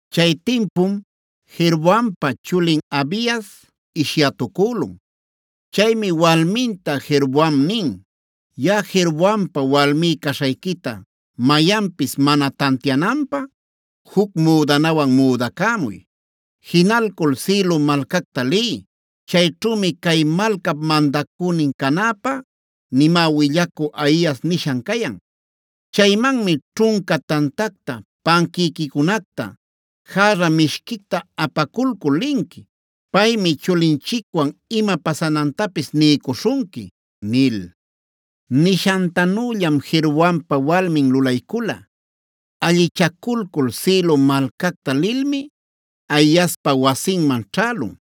Chay timpum Jeroboampa chulin Abias ishyätucülun. Chaymi walminta Jeroboam nin: “Yaꞌa Jeroboampa walmí caśhayquita mayanpis mana tantiananpä juc müdanawan müdacämuy. Jinalcul Silo malcacta liy. Chayćhümi cay malcap mandacünin canäpä nimä willacü Ahias nishan cayan. Chaymanmi ćhunca tantacta, panquïquicunacta, järra mishquicta apaculcul linqui. Paymi chulinchicwan ima pasanantapis niycuśhunqui” nil. Nishantanüllam Jeroboampa walmin lulaycula. Allichaculcul Silo malcacta lilmi Ahiaspa wasinman ćhälun.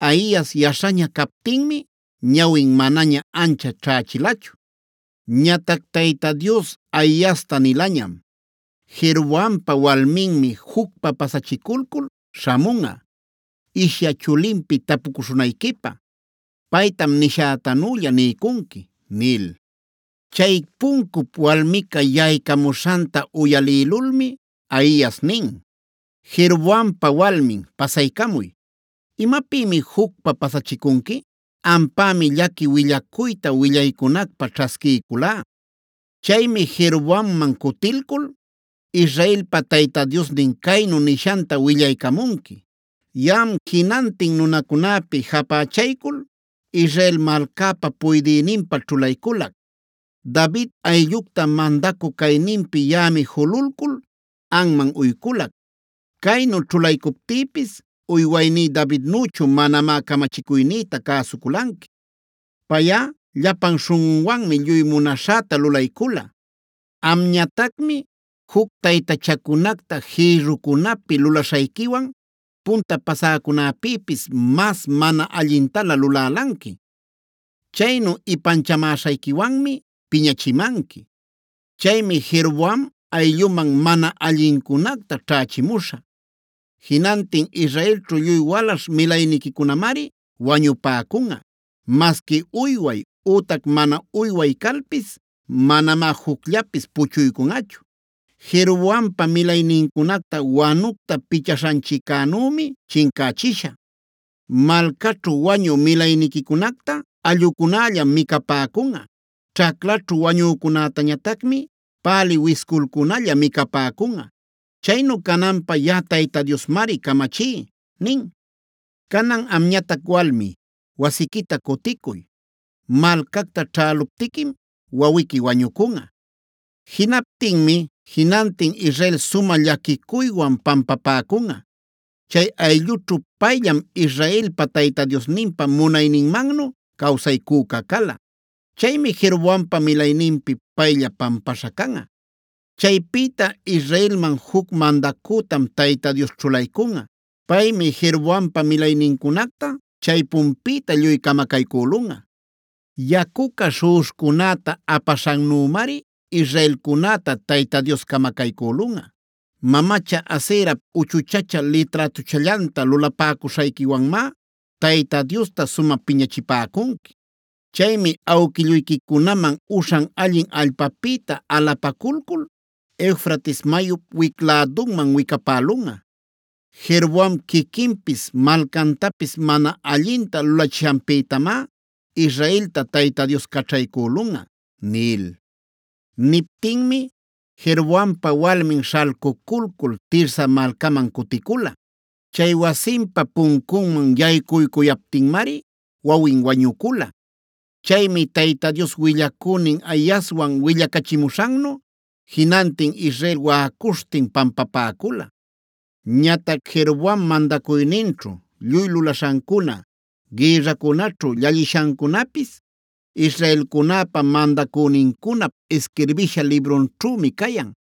Ahias yaśhaña captinmi ñawin manaña ancha ćhächilachu. Ñatac Tayta Dios Ahiasta nilañam: “Jeroboampa walminmi jucpa pasachiculcul śhamunꞌa ishya chulinpi tapucuśhunayquipä. Paytam nishätanülla niycunqui” nil. Chay puncup walmica yaycamuśhanta uyalïlulmi Ahias nin: “Jeroboampa walmin pasaycamuy. ¿Imapïmi jucpa pasachicunqui? Ampämi llaqui willacuyta willaycunacpä ćhasquiyculá. Chaymi Jeroboamman cutilcul Israelpa Tayta Diosnin caynu nishanta willaycamunqui: ‘Yaꞌam jinantin nunäcunapi japächaycul Israel malcäpa puydïninpä ćhulayculac. David ayllucta mandacü cayninpi yaꞌami jululcul anman uyculac. Caynu ćhulaycuptïpis uywayní Davidnüchu manamá camachicuynïta cäsuculanqui. Payꞌa llapan śhunꞌunwanmi lluy munaśhäta lulaycula. Amñatacmi juc taytachacunacta jïrrucunapi lulaśhayquiwan punta pasäcunäpïpis mas mana allintalä lulälanqui. Chaynu ipanchamäśhayquiwanmi piñachimanqui. Chaymi Jeroboam aylluman mana allincunacta ćhächimuśhä. Jinantin israelćhu lluy walaśh milayniquicunamari wañupäcunꞌa, masqui uyway ütac mana uyway calpis. Manamá jucllapis puchuycunꞌachu.a Jeroboampa milaynincunacta wanucta pichaśhanchiccänümi chincächishä. Malcaćhu wañü milayniquicunacta allꞌucunallam micapäcunꞌa. Ćhaclaćhu wañücunätañatacmi pälï wisculcunalla micapäcunꞌa. Chaynu cananpä yaꞌa Tayta Diosmari camachí’ nin. “Canan amñatac walmi, wasiquita cuticuy. Malcacta ćhäluptiquim wawiqui wañucunꞌa. Jinaptinmi jinantin Israel sumä llaquicuywan pampapäcunꞌa. Chay ayllućhu payllam Israelpa Tayta Diosninpa munayninmannu cawsaycüca cala. Chaymi Jeroboampa milayninpi paylla pampaśha canꞌa. Chaypïta israelman juc mandacütam Tayta Dios ćhulaycunꞌa. Paymi Jeroboampa milaynincunacta chaypunpïta lluy camacaycülunꞌa. Yacuca śhuꞌuśhcunäta apaśhannümari israelcunäta Tayta Dios camacaycülunꞌa. Mamacha Aserap uchuchachä liträtuchallanta lulapäcuśhayquiwanmá Tayta Diosta sumä piñachipäcunqui. Chaymi awquilluyquicunaman uśhan allin allpapïta alapaculcul Eufrates mayup wic lädunman wicapälunꞌa. Jeroboam quiquinpis malcantapis mana allinta lulachishanpïtamá Israelta Tayta Dios caćhaycülunꞌa” nil. Niptinmi Jeroboampa walmin śhalcuculcul Tirsa malcaman cuticula. Chay wasinpa puncunman yaycuycuyaptinmari wawin wañucula. Chaymi Tayta Dios willacünin Ahiaswan willacachimuśhannu jinantin Israel waꞌacuśhtin pampapäcula. Ñatac Jeroboam mandacuyninćhu lluy lulaśhancuna, gïrracunaćhu llallishancunapis israelcunäpa mandacünincunap isquirbisha librunćhümi cayan.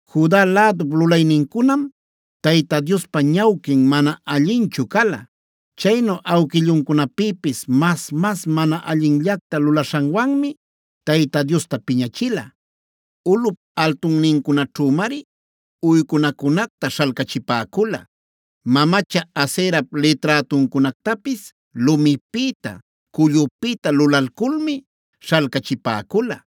Juda lädup lulaynincunam Tayta Diospa ñawquin mana allinchu cala. Chaynu awquilluncunapïpis mas-mas mana allinllacta lulaśhanwanmi Tayta Diosta piñachila. Ulꞌup altunnincunaćhümari uycunacunacta śhalcachipäcula; mamacha Aserap liträtuncunactapis lumipïta, cullupïta lulalculmi śhalcachipäcula,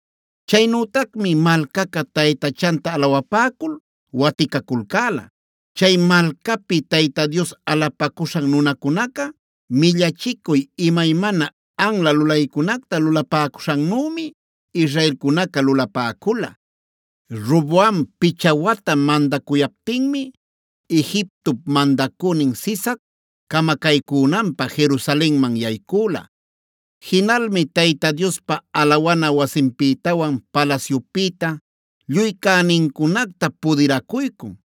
Chaynütacmi malcaca taytachanta alawapäcul waticaculcäla.c Chay malcapi Tayta Dios alapacuśhan nunacunaca millachicuy imaymana anla lulaycunacta lulapäcuśhannümi israelcunaca lulapäcula. Roboam picha wata mandacuyaptinmi Egiptop mandacünin Sisac camacaycünanpä Jerusalenman yaycüla.d Jinalmi Tayta Diospa alawana wasinpïtawan palasyupïta lluy cänincunacta pudiracuycun.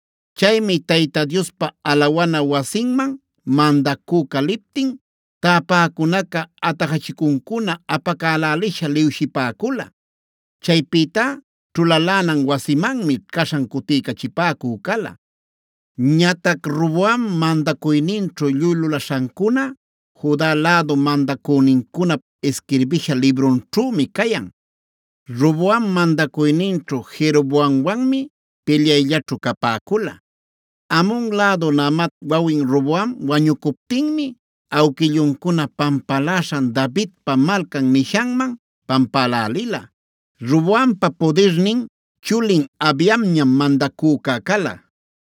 Chaymi Tayta Diospa alawana wasinman mandacüca liptin täpäcunaca atajachicuncuna apacälälisha liwshipäcula. Chaypïtá ćhulalänan wasimanmi caśhan cutiycachipäcü cala. Ñatac Roboam mandacuyninćhu lluy lulaśhancuna Juda lädu mandacünincunap isquirbisha librunćhümi cayan. Roboam mandacuyninćhu Jeroboamwanmi pilyayllaćhu capäcula. Amon lädu Naamap wawin Roboam wañucuptinmi awquilluncuna pampaläśhan Davidpa Malcan nishanman pampälälila. Roboampa pudirnin chulin Abiamñam mandacüca cala.